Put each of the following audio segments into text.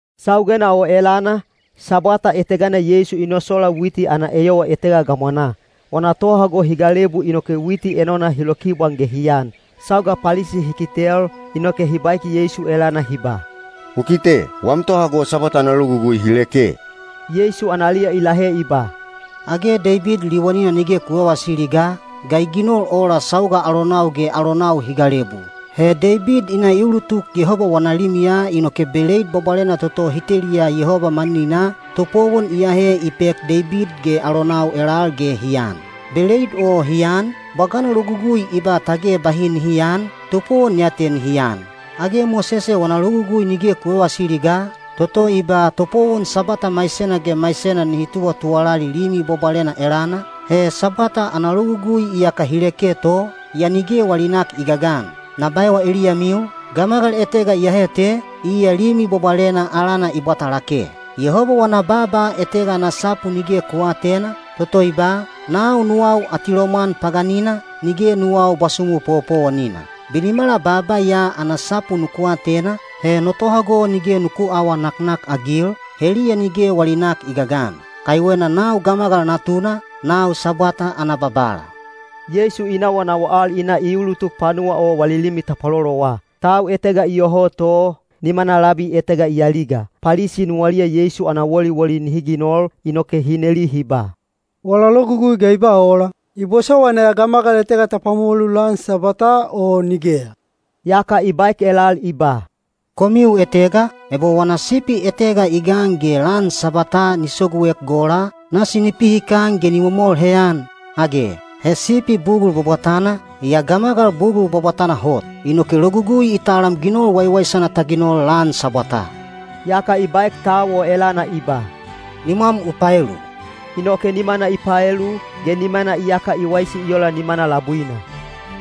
Saugena o elana, Sabwata etegana Yeisu i nosola witi ana eyowa etega gamwanaa. Wana tohago hi galebu inoke witi enona hi lokibwaan ge hi an. Sauga Palisi hi kitel, inoke hi baek Yeisu elana hi ba, “U kite, wam tohago Sabwata ana logugui hi leke.” Yeisu analiya i lahe i ba, “Age Deibid liwanina nige ku vavasili ga, ga i ginol ola sauga alonau ge alonau hi galebu? He Deibid i na i ulutuk Yehoba wana limiya inoke beleid bwabwalena toto hi teliya Yehoba manininaa, topowon i ahe i pek Deibid ge alonau elal ge hi an. Beleid o hi an, bwagana logugui i ba tage bahi nihi aan, topowon ya te nihi an. Age Mosese wana Logugui nige ku vavasili ga, toto i ba topowon Sabwata maisena ge maisena nihi tuwatuwalali limi bwabwalena elana? He Sabwata ana logugui iyaka hi leke to, yaa nige wali nak i gagan. Na baewa eliyamiu, gamagal etega iyahe te, iya limi bwabwalena alana i bwata lake. Yehoba wana baaba etega ana sapu nige ku aatena, toto i ba, ‘Nau nuwau atilomwan paganina, nige nuwau bwasumu powopowonina.’ Binimala baaba ya ana sapu nuku atena, he no tohago nige nuku aawa naknakagil, heliya nige wali nak i gagan. Kaiwena nau Gamagal Natuna, nau Sabwata ana Babala.” Yeisu i nawanawa al i na i ulutuk panuwa o wali limi tapwalolowa. Tau etega iyoho to, nimana labi etega i aliga. Palisi nuwaliya Yeisu ana woliwoli nihi ginol, inoke hi neli hi ba, “Wala logugui ga i ba ola? I bosowaina ya gamagal etega ta pwamolu lan Sabwataa o nigeya?” Yaka i baek elal i ba, “Komiu etega, ebo wana sipi etega i gan ge lan Sabwataa ni soguek gola, nasi ni pihikan ge ni momol heyan, age? He sipi bugul bwabwatana, yaa gamagal bugul bwabwatana hot. Inoke Logugui i talam ginol waiwaisana ta ginol lan Sabwataa.” Yaka i baek tau o elana i ba, “Nimwam u paelu.” Inoke nimana i paelu, ge nimana iyaka i waisi i ola nimana labuina.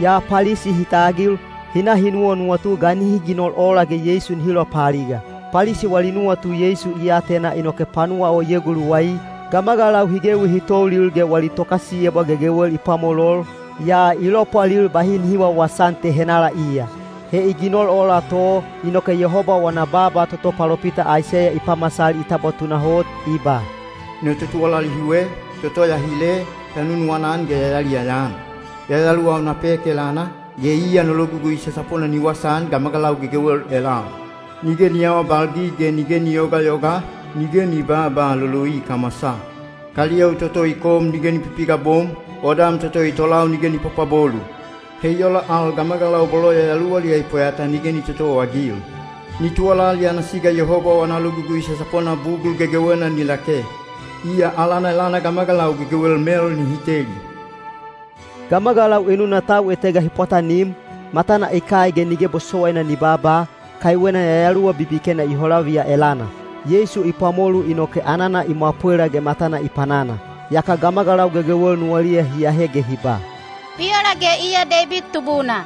Yaa Palisi hi tagil, hi na hi nuwanuwatu ga nihi ginol ola ge Yeisu nihi lopaaliga. Palisi wali nuwatu Yeisu i atena inoke panuwa o i eguluwai. Gamagalau hi gewi hi toulil ge wali tokasiyebwa gegewel i pwamolol, yaa i lopwalil bahi nihi wawasaan te henala iya. He i ginol ola to, inoke Yehoba wana baaba toto palopita Aiseya i pamasal i tabwa tunahot, i ba: No totuwalali hiwe, toto ya hile, ya nunuwana-an ge ya yaliyaya-an. Yayaluwau na pek elana, ge iya no logugui sasapona ni wasaan gamagalau gegewel elal. Nige ni aawabalgig ge nige ni yogayoga, nige ni babaa loloi kamwasaa. Kaliyou toto i kom nige ni pipigabom, odam toto i tolau nige ni pwapwabolu. He i ola al gamagalau bolo yayaluwaliya i pweyata nige ni totowaagil. Ni tuwalali ana siga Yehoba wana logugui sasapona bugul gegewena ni lake. Iya alana elana gamagalau gegewel mel nihi teli. Gamagalau enuna tau etega hi pwatanim, matana i kai ge nige bosowaina ni baaba, kaiwena yayaluwa bibikena i holaviya elana. Yeisu i pwamolu inoke anana i mwapwela ge matana i panana. Yaka gamagalau gegewel nuwaliya hi ahe ge hi ba, “Bi ola ge iya Deibid Tubuna?”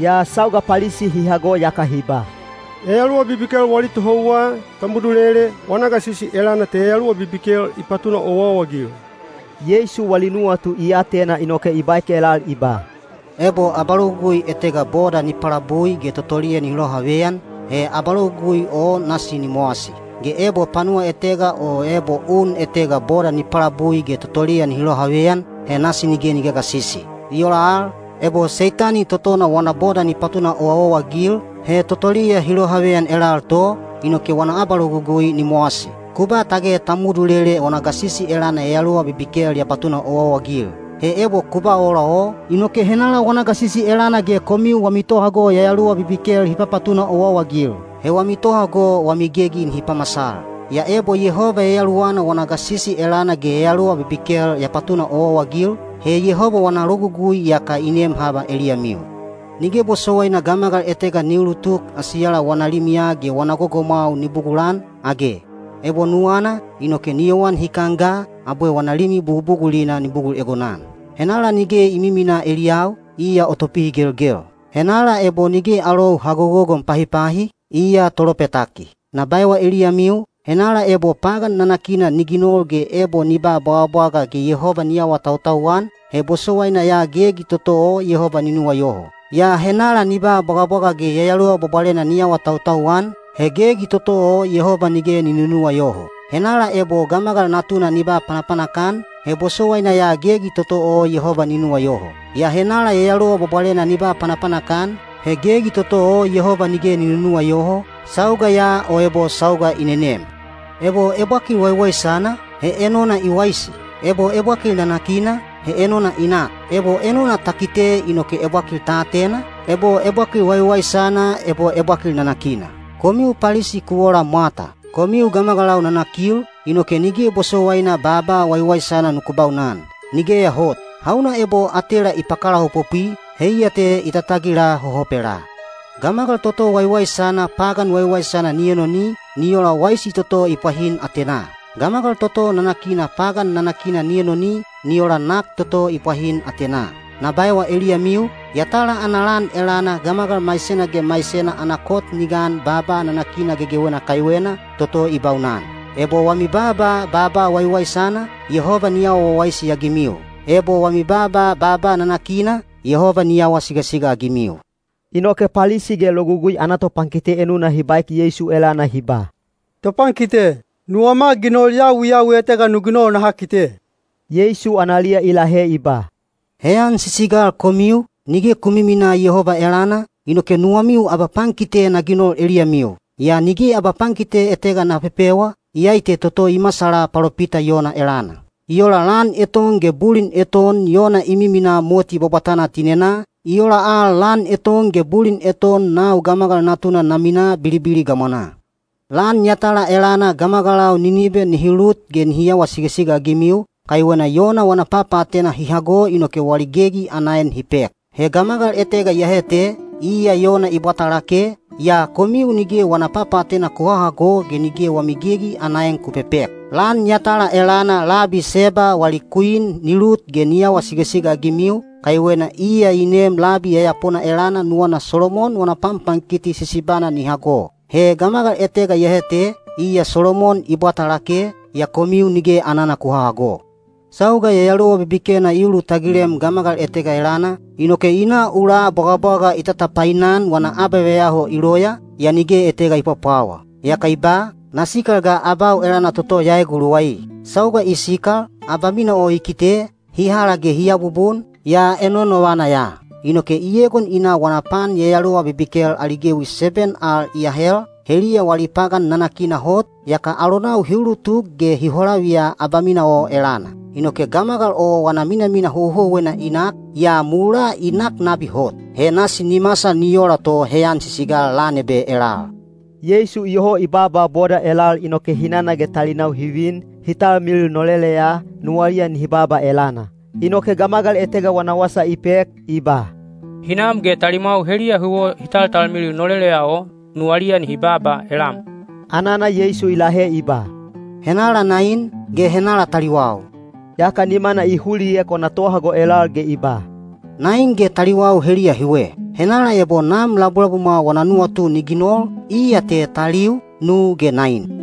Yaa sauga Palisi hi hago yaka hi ba, “Yayaluwa bibikel wali tohouwa, Tamudulele, wana gasisi elana te yayaluwa bibikel i papatuna owaowa-agil.” Wali nuwatu Yeisu i atena inoke i baek elal i ba, “Ebo abalogugui etega boda ni palabui ge totoliya nihi lohaveyan, he abalogugui o nasi ni mowasi. Ge ebo panuwa etega o ebo un etega boda ni palabui ge totoliya nihi lohaveyan, he nasi nige ni gagasisi. I ola al, ebo Seitani totona wana boda ni patuna owaowa-agil, he totoliya hi lohaveyan elal to, inoke wana abalogugui ni mowasi. Ku ba tage Tamudulele wana gasisi elana yayaluwa bibikel ya papatuna owaowa-agil. He ebo ku ba ola o, inoke henala wana gasisi elana ge komiu wami tohago yayaluwa bibikel hi papatuna owaowa-agil? He wami tohago wami gegi nihi pamasal. Yaa ebo Yehoba Yayaluwana wana gasisi elana ge yayaluwa bibikel ya papatuna owaowa-agil, he Yehoba wana logugui iyaka i nem haba eliyamiu. “Nige bosowaina gamagal etega ni ulutuk asiyala wana limiya ge wana gogomwau ni bugulan, age? Ebo nuwana, inoke ni yowan hikan ga, abwe wana limi bugubugulina ni bugul egonan. “Henala nige i miminaa eliyau, iya o topihigelgel. Henala ebo nige alou ha gogogon pahipahi, iya tolopetaki. Na baewa eliyamiu, henala ebo pagan nanakina ni ginol ge ebo ni ba bwagabwaga ge Yehoba ni awatautau-an, he bosowaina ya gegi toto o Yehoba ni nuwayoho. Yaa henala ni ba bwagabwaga ge Yayaluwa Bwabwalena ni awatautau-an, he gegi toto o Yehoba nige ni nunuwayoho. Henala ebo Gamagal Natuna ni ba panapanak-an, he bosowaina ya gegi toto o Yehoba ni nuwayoho. Yaa henala Yayaluwa Bwabwalena ni ba panapanak-an, he gegi toto o Yehoba nige ni nunuwayoho, sauga ya o ebo sauga i nenem. “Ebo ebwakil waiwaisana, he enona i waisi. Ebo ebwakil nanakina, he enona i nak. Ebo enona ta kite inoke ebwakil ta atena, ebo ebwakil waiwaisana ebo ebwakil nanakina. Komiu Palisi ku ola mwata! Komiu gamagalau nanakil, inoke nige bosowaina baaba waiwaisana nuku baunan. Nigeya hot! Hauna ebo atela i pakalaopopwi, heiya te i tatagila hohopelaa. Gamagal toto waiwaisana pagan waiwaisana ni enoni, ni ola waisi toto i pwahin atenaa. Gamagal toto nanakina pagan nanakina ni enoni, ni ola nak toto i pwahin atenaa. “Na baewa eliyamiu, yatala ana lan elana gamagal maisena ge maisena ana kot ni gan baaba nanakina gegewena kaiwena, toto i baunan. Ebo wami baaba baaba waiwaisana, Yehoba ni awa wawaisi-agimiu. Ebo wami baaba baaba nanakina, Yehoba ni awa sigasiga-agimiu.” Inoke Palisi ge Logugui ana topankite enuna hi baek Yeisu elana hi ba, “Topankite, nuwama ginol yawiyawi etega nu ginol naha kite.” Yeisu analiya i lahe i ba, “Heyan sisigal komiu, nige ku miminaa Yehoba elana, inoke nuwamiu abapankite na ginol eliyamiu. Yaa nige abapankite etega na pepewa, iyai te toto i masala palopita Yona elana. I ola lan eton ge bulin eton Yona i miminaa moti bwabwatana tinenaa, i ola al lan eton ge bulin eton nau Gamagal Natuna na minaa bilibili gamwanaa. Lan yatala elana gamagalau Ninibe nihi lut ge nihi awa sigasiga-agimiu, kaiwena Yona wana papaatena hi hago inoke wali gegi ana en hi pek. He gamagal etega iyahe te, iya Yona i bwata lake, yaa komiu nige wana papaatena ku hahago ge nige wami gegi ana en ku pepek. Lan yatala elana labi Seba wali kwin ni lut ge ni awa sigasiga-agimiu, kaiwena iya i neem labi yayapona elana nuwana Solomon wana panpankiti sisibana ni hago. He gamagal etega iyahe te, iya Solomon i bwata lake, yaa komiu nige anana ku hahago.” “Sauga yayaluwa bibikena i ulutagilem gamagal etega elana, inoke i na ula bwagabwaga i tatapainan wana abaveyaho i loya, yaa nige etega i pwapwawa. Yaka i ba, ‘Na sikal ga abau elana toto ya eguluwai.’ Sauga i sikal, abamina o i kite, hi hala ge hi abubun, yaa enonovana ya. Inoke i egon i na wana pan yayaluwa bibikel ali gewi seben al i ahel, heliya wali pagan nanakina hot, yaka alonau hi ulutuk ge hi holaviya abamina o elana. Inoke gamagal o wana minamina houhouwena i nak, yaa mulaa i nak nabi hot. He nasi ni masal ni ola to heyan sisigal lan ebe elal.” Yeisu iyoho i baaba boda elal inoke hinana ge talinau hi vin, hi talmilil noleleya, nuwaliya nihi baaba elana. Inoke gamagal etega wana wasa i pek, i ba, “Hinam ge talimwau heliya huwo hi taltalmilil noleleya o, nuwaliya nihi baaba elam.” Anana Yeisu i lahe i ba, “Henala nain, ge henalau taliwau?” Yaka nimana i huliek wana tohago elal ge i ba, “Nain ge taliwau heliya hiwe! Henala ebo Nam labulabumwa wana nuwatu ni ginol, iya te taliu, nu ge nain.”